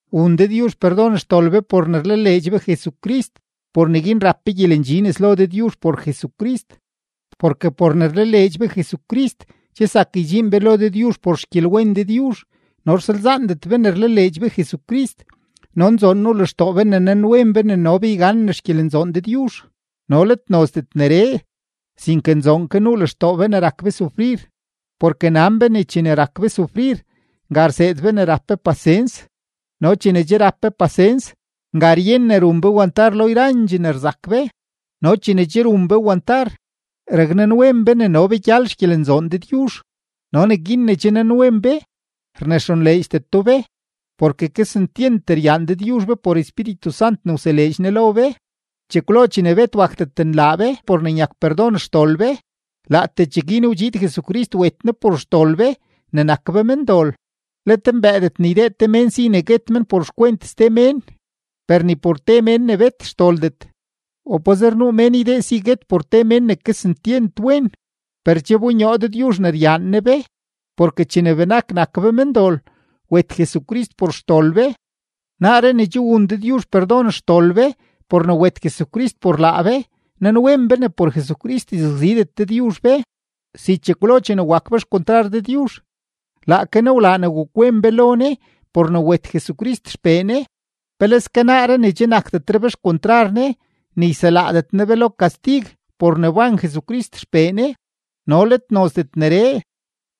Wun Dëdyuzh perdon xdol be por ne rlaleedx be Jesucrist, por neguin rap be gyelendxi nes lo Dëdyuzh por Jesucrist. Porke por ne rlaleedx be Jesucrist, che zak ydxiin be lo Dëdyuzh por xgyelwen Dëdyuzh no rsalzaandet be ne rlaleedx be Jesucrist, no nzoon nuu lextoo be ne nanwen be ne no be yganen xgyelenzoon Dëdyuzh. No let nozdet neree, sinke nunzoon ke lextoo be ne rak be sufrir, porke nan be ne chene rak be sufrir, nga rseed be rap be pasens. No chene che rap be pasens, nga ryen ne run be wantar lo yrandxee ne rzak be, no chene che run be wantar, raknanwen be ne no be gyal xgyelenzoon Dëdyuzh. No neguin ne che nanwen be rnexonleedxdeto be, porke kesentyent ryaan Dëdyuzh be por Espíritu Sant ne wseleedx Ne lo be. Chekwlo chene bet wakdet nlaa be por ne nyak perdon xdol be, laatee cheguin wdxiid Jesucrist wet Ne por xdol be ne nak be mendol. Let mbëëdet ne ydee te mén si ne guet men por xkwent ste mén, per ni por te mén ne bet xdoldet, o pazer nuu mén ydee si guet por te men ne kesentyent wen. Per che wbonyoo Dëdyuzh ne ryaan Ne be, porke chene benak nak be mendol, wet Jesucrist por xdol be. Naaree ne che wun Dëdyuzh perdon xdol be por ne wet Jesucrist por laa be, nanwen be ne por Jesucrist yzakzidet Dëdyuzh be. Si chekwlo chene wak be xkontrar Dëdyuzh, laake Ne wlaa ne wakwen be lo Ne por ne wet Jesucrist XPee Ne, ¡peleske naaree ne che nakdetre be xkontrar Ne, ne yselaadet Ne be lo kastig por ne wban Jesucrist XPee Ne! No let nozdet neree,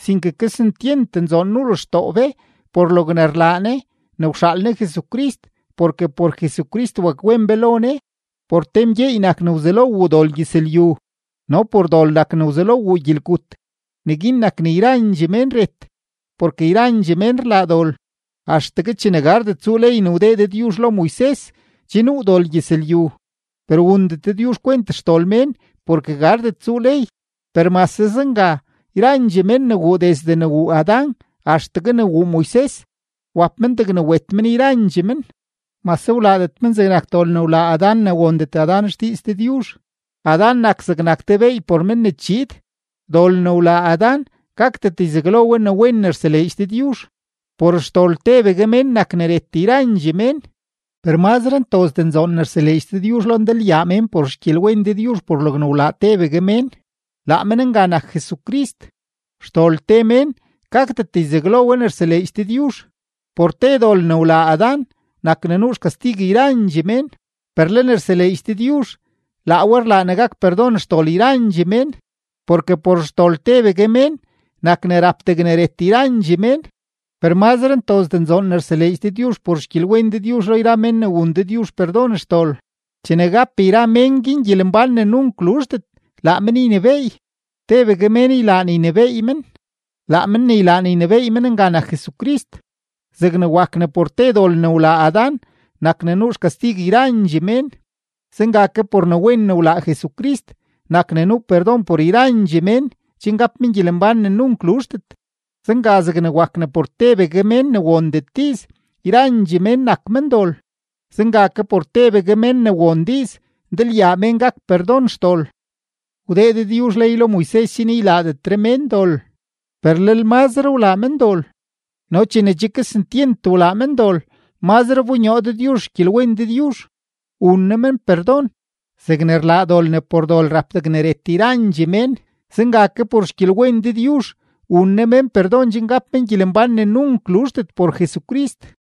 sinke kesentyent nzoon nuu lextoo be por logne rlaa Ne ne wxaal Ne Jesucrist porke por Jesucrist wakwen be lo Ne. Por te mgyeey nak ne wzelo wuu dol gyëzlyu no por dol nak ne wzelo wuu gyelgut, neguin nak ne yrandxee mén ret, porke yrandxee men rlaa dol. Axtegue chene gardet tsuu ley ne wdee Dëdyuzh lo Moises, che nuu dol gyëzlyu; per wundet Dëdyuzh kwent xdol mén porke gardet tsuu ley. Per mase zenga, yrandxee mén ne wuu desde ne wuu Adán axtegue ne wuu Moises, wap men degne wet men yrandxee men, mase wlaadet men zegnak dol ne wlaa Adán ne wondet Adán xdiiz Dëdyuzh; Adán nak zegnak te beey por men ne chiid. Dol ne wlaa Adán gakdet yzaglo we ne wen ne rseleedx Dëdyuzh. Por xdol tebegue mén nak ne ret yrandxee mén, per mazre ntozdee nzoon ne rseleedx Dëdyuzh lo ndalyaa mén por xgyelwen Dëdyuzh por logne wlaa tebegue mén, laa men nga nak Jesucrist. Xdol te mén gakdet yzaglo we ne rseleedx Dëdyuzh. Por te dol ne wlaa Adán nak ne nuu xkastig yrandxee mén, per le ne rseleedx Dëdyuzh laa we rlaa ne gak perdon xdol yrandxee mén. Porke por xdol tebegue mén nak ne rap degne ret yrandxee mén, per mazre ntozdee nzoon ne rseleedx Dëdyuzh por xgyelwen Dëdyuzh lo yra men ne wun Dëdyuzh perdon xdol; chene gap yra men guin gyelembán ne nunk luzhdet, laa men ynebééy, tebegue mén ylaa ne ynebééy men; laa men ne ylaa ne ynebééy men nga nak Jesucrist. Zegne wak ne por te dol ne wlaa Adán nak ne nuu xkastig yrandxee mén, zenga ke por ne wen ne wlaa Jesucrist nak ne nuu perdon por yrandxee mén chen gap men gyelembán ne nunk luzhdet. Zenga zegne wak ne por tebegue mén ne wondet diiz, yrandxee mén nak mendol, zenga ke por tebegue mén ne won diiz, ndalyaa mén gak perdon xdol. Wdee Dëdyuzh ley lo Moises chen ylaadetre mén dol, per lel mazre walaa men dol, no chene che kesentyent wlaa men dol, mazre wbonyoo Dëdyuzh xgyelwen Dëdyuzh, wun Ne men perdon. Zegne rlaa dol ne por dol rap degne ret yrandxee mén, zenga ke por xgyelwen Dëdyuzh wun Ne mén perdon chen gap men gyelembán ne nunk luzhdet por Jesucrist.